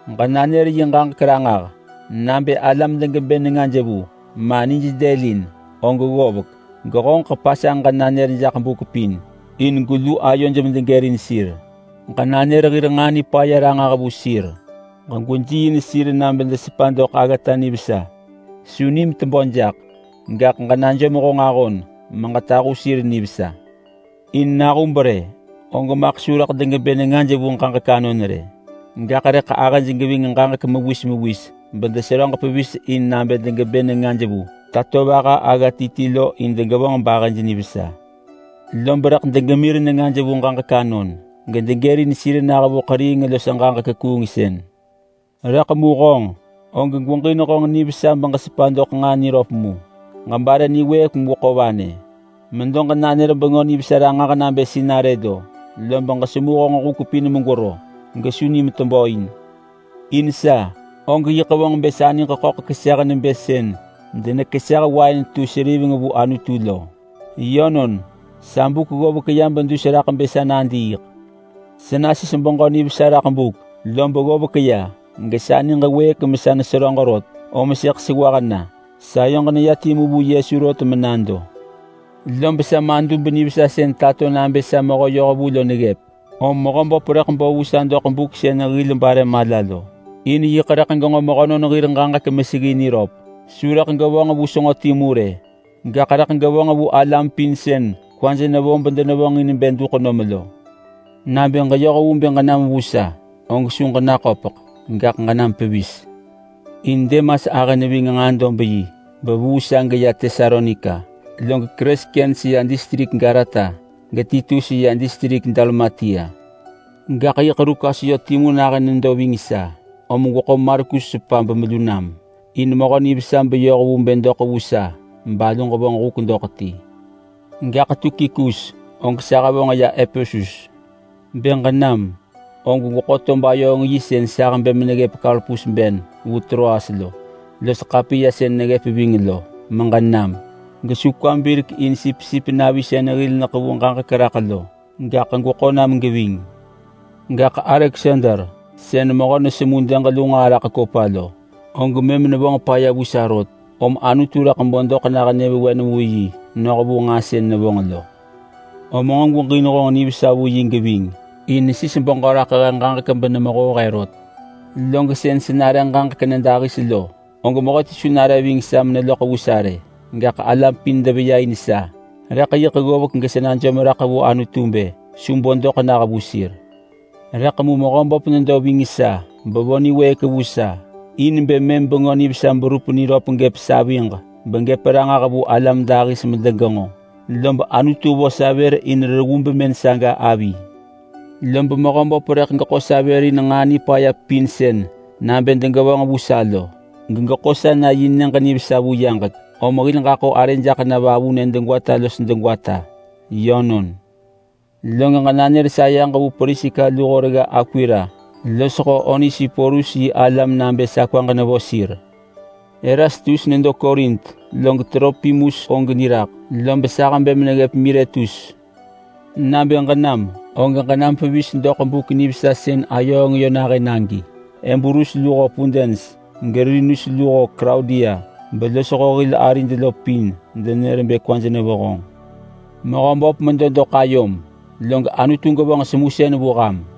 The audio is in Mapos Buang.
Ġenanër yi ġaġek ranġah! Nabë alam degebë nengaj vu, ma nij dëlin, og ggovek gehonġeḳ pasanġ ġenanër jaḳ buk pin, in gwelu ayoj medegërin sir. Ġenanër hir nġaa nipaya ranġah vu sir. Ġegwejiiin sir nabë desepa doḳ aggata nivesa. Su nim tebö jaḳ, gaḳ ġenajom honġ ahon meġetahu sir nivesa. In nahub rë og maḳ su rëḳ degebë nengaj vu ġaġek anon rë. Gaḳ rëḳ ahëj geving ġaġek mewis mewis begetup deseröġ in nabë degebë nengaj vu tatovaha agga ti ti lo in degevonġ bahëj nivesa. Lob rëḳ degemir nengaj vu ġaġek anon, gedegërin sir nah vu ḳeriing los ġaġek kuungsën. Rëḳ mu honġ, og gweġin honġ nivesa beġesepa doḳ nġaa niröp mu. Ġebare niwëëk megweḳo vanë. Geġemedo meġenanër Bengö Nivesa ranġah nabë sinarë lo, lob ġesemu honġ huk pin megwero, gesu nim tebö in. In sa, og yiḳ vonġ bë sa niġ ḳöḳ keseh nebë sën denekeseh wain tu seriveng vu Anutu lo. Yönon, sa buk ggovek ya bedus raḳ bë sa nadiiḳ. Sa nasis beġö nivesa raḳ buk, lob ggovek ya. Gesa niġ wëëk mesa neseröġ rot, om sëḳ sewah na. Sayoġ neya timu vu Yesu rot menado. Lob sa madub nivesa sën tato nabë sa mehö yohvu lo neggëp, om Mehöböp rëḳ bo vu sa doḳ buk sën hil bare mala lo in yiḳ rëḳ genġo mehönon hir ġaġek meseggi niröp. Su rëḳ gevonġ vu senġo timu rë, gaḳ rëḳ gevonġ vu alam pin sën kwaj nevo bedenevonġin bë duḳ nom lo. Nabë ġeyoh vu bë ġenam vu sa, og su ġenaköpeḳ, gaḳ ġenam pevis. In Demas ahë neving nġaa-dob-yi bevuu sa ya geya Tesalonika, log Kreskens ya distrik Galata, geTitus ya distrik Dalmatia. Gaḳ yiḳ Lukas yö timu nahën nedo ving sa. Om gweḳo Markus sepa bemelu nam, in mehö nivesa beyoh vu bë doḳ vu sa balu ġevonġ huk doḳ ti. Gaḳ Tukikus, og sa hevonġ ya Epesus. Bë ġenam, og gweḳo tob-ayööng-yi sën sa hebë meneggëp Karpus ben vu Troas lo, los ḳapiya sën neggëp ving lo, meġenam. Gesu kwam birek in sipsip navi sën hil neḳevu ġaġek raḳ lo, gaḳ gweḳo nam geving. Gaḳ Aleksander sën mehö nesemu dëg lu nġaa raḳ kopa lo, og mëm nevonġ paya vu sa rot, om Anutu rëḳ bo doḳ nah nyëvewen vu yi noh vu nġaa sën nevonġ lo. Om nġo gweġin honġ nivesa vu yi geving, in nesis beġö raḳ he ġaġek benemehoo he rot. Log sën sa nare ġaġek nyëdahis lo, og mehöti su nare ving sa meneloḳ vu sa rë. Gaḳ alam pin deveya in sa, rëḳ yiḳ ggovek gesa najom raḳ vu Anutu bë su bo doḳ nah vu sir. Rëḳ mu Mehöböp nedo ving sa bevo niwëëk vu sa in bë mëm Bengö Nivesa berup niröp gëp saviġ begëp ranġah vu alam dahis medegenġo, lob Anutu vo sa vër in reggu bemën saga avi. Lob Mehöböp rëḳ geḳo sa vër in nġaa nipaya pin sën nabë degevonġ vu sa lo, gegeḳo sa na yi nyëġ nivesa vu yaġek. Om hil ġaḳo arë jaḳ na vavunë degwata los degwata. Yönon. Log ġenanër sayeġ vu Priska luho regga Akwila losho Onesiporus yi alam nabë sa kwaġ nevo sir. Erastus nedo Korint, log Tropimus og niraḳ, lob sa hebë meneggëp Miletus. Nabë ġenam, og ġenam pevis doḳ buk nivesa sën ayööng yö nahën agi. Ebulus luho Pudens geLinus luho Klaudia belosho hil arid lo pin denër bë kwaj nevo honġ. Mehöböp medo doḳ ayom, log Anutu gevonġ semusën vu ham.